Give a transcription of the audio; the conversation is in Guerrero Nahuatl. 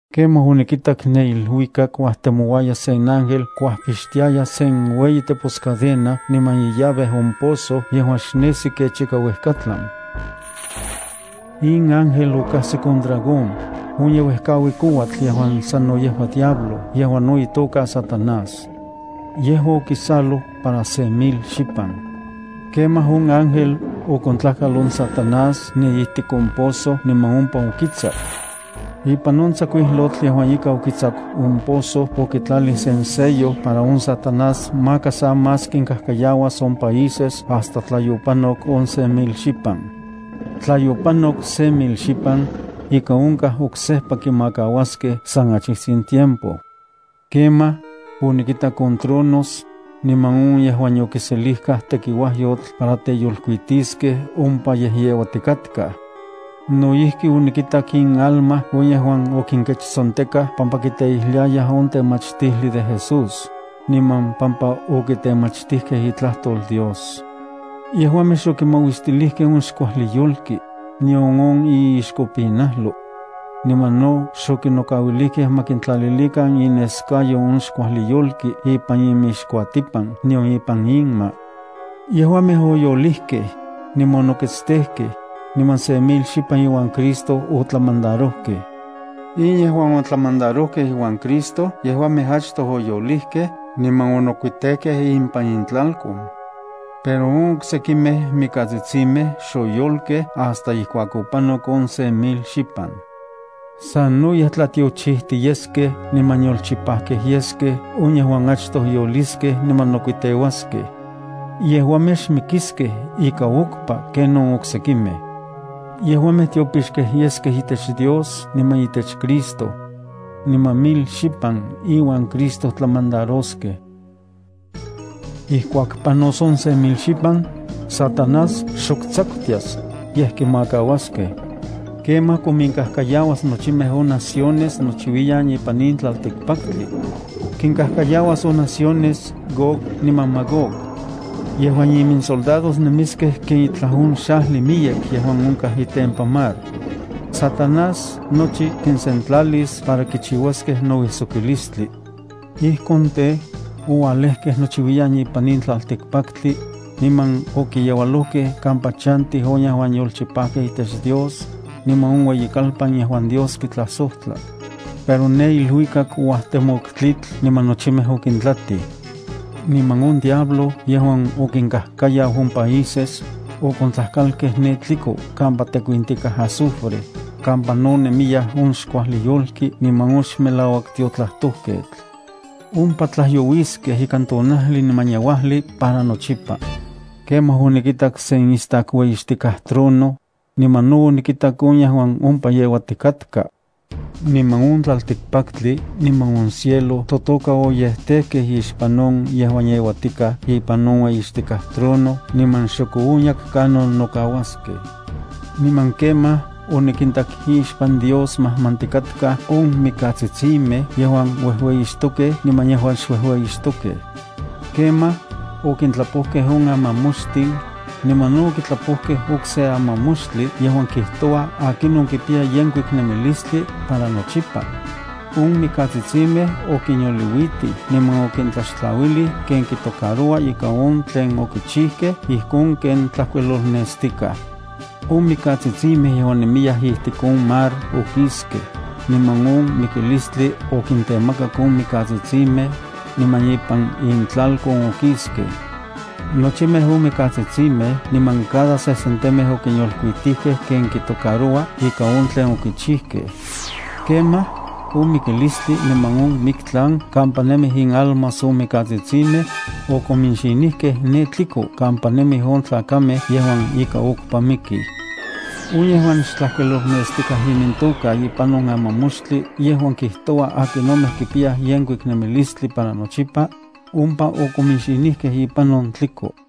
Kemaj onikitak ne iluikak uajtemouaya sen ángel kuajmapixtiaya sen ueyi teposcadena niman illave on pozo yejuan xnesi kech ika uejkatlan. In ángel okajsik on dragón, on yeuejkaui kouatl yejuan sano yejua diablo yejuan no itoka Satanás. Yejua okisaloj para se mil xipan. Kemaj on ángel okontlajkal on Satanás ne ijtik on pozo niman ompa okitsaku. Ipan on tsakuijlotl yejuan ika okitsaku on pozo okitlalij sen sello para on Satanás maka sa más kinkajkayauas on países hasta tla yopanok on se mil xipan. Tla yopanok se mil xipan, ika onkaj oksejpa kimakauaskej san achijtsin tiempo. Kemaj, onikintak on tronos, niman on yejuan yokiselijkaj tekiuajyotl para teyolkuitiskej ompa yejyeuatikatkaj. No ijki onikintak inalma on yejuan okinkechtsontekaj pampa kiteijliayaj on temachtijli de Jesús, niman pampa okitemachtijkej itlajtol Dios. Yejuamej xokimauistilijkej on xkuajli yolki, nion on iixkopinajlo. Niman no xokinnokauilijkej ma kintlalilikan ineskayo on xkuajli yolki ipan inmixkuatipan nion ipan inma. Yejuamej oyolijkej, niman onoketstejkej, niman se mil xipan iuan Cristo otlamandarojkej. In yejuan otlamandarojkej iuan Cristo yejuamej achtoj oyolijkej niman onokuitejkej impan intlalkon. Pero on oksekimej mikatsitsimej xoyolkej hasta ijkuak opanok on se mil xipan. Sanoyej tlatiochijti yeskej niman yolchipajkej yeskej on yejuan achtoj yoliskej niman nokuiteuaskej. Yejuamej xmikiskej ika okpa ken on oksekimej. Yejuamej tiopixkej yeskej itech Dios niman itech Cristo. Niman mil xipan iuan Cristo tlamandaroskej. Ijkuak panos on se mil xipan, Satanás xok tsakutias, yej kimakauaskej. Kemaj kominkajkayauas nochimej on naciones nochiuiyan ipan in tlaltikpaktli. Kinkajkayauas on naciones Gog niman Magog. Yejuan iminsoldados, nemiskej ken itlaj on xajli miyek yejuan onkaj itempan mar. Satanás nochi kinsentlalis para kichiuaskej nouijsokilistli. Ijkon tej, oualejkej nochiuiyan ipan in tlaltikpaktli, niman okiyeualojkej kampa chantij on yejuan yolchipajkej itech Dios, niman on ueyikalpan yejuan Dios kitlajsojtla. Pero ne iluikak ouajtemok tlitl niman nochimej okintlatij. Niman on diablo yejuan okinkajkayau on países, okontlajkalkej ne tliko kampa tekuintikaj azufre, kampa no nemiya on xkuajli yolki niman on xmelauak tiotlajtojketl. Ompa tlajyouiskej ikan tonajli niman yeuajli para nochipa. Kemaj onikitak sen istak ueyixtikaj trono, niman no onikitak on yejuan ompa yeuatikatka. Niman on tlaltikpaktli niman on cielo totoka oyejtejkej ixpan on yejuan yeuatikaj ipan on ueyixtikaj trono niman xok oonyak kanon nokauaskej. Niman kemaj onikintak ixpan Dios majmantikatkaj on mikatsitsimej yejuan uejueyixtokej niman yejuan xuejueyixtokej. Kemaj, okintlapojkej on amamoxtin, niman no okitlapojkej okse amamoxtli yejuan kijtoua akinon kipiya yenkuik nemilistli para nochipa. On mikatsitsimej okinyolkuitij niman okintlaxtlauilij ken kitocaroua ika on tlen okichijkej ijkon ken tlajkuilolnestikaj. On mikatsitsimej yejuan nemiyaj ijtik on mar okiskej, niman on mikilistli okintemakak on mikatsitsimej, niman ipan intlalkon okiskej. Nochimej on mikatsitsimej niman cada sesentemej okinyolkuitijkej ken kitocaroua ika on tlen okichijkej. Kemaj, on mikilistli niman on miktlan kampa nemij inalmas on mikatsitsimej, okominxinijkej ne tliko kampa nemij on tlakamej yejuan ika okpa mikij. On yejuan xtlajkuilolnestikatka imintoka ipan on amamoxtli yejuan kijtoua akinomej kipiyaj yenkuik nemilistli para nochipa, ompa okominxinijkej ipan on tliko.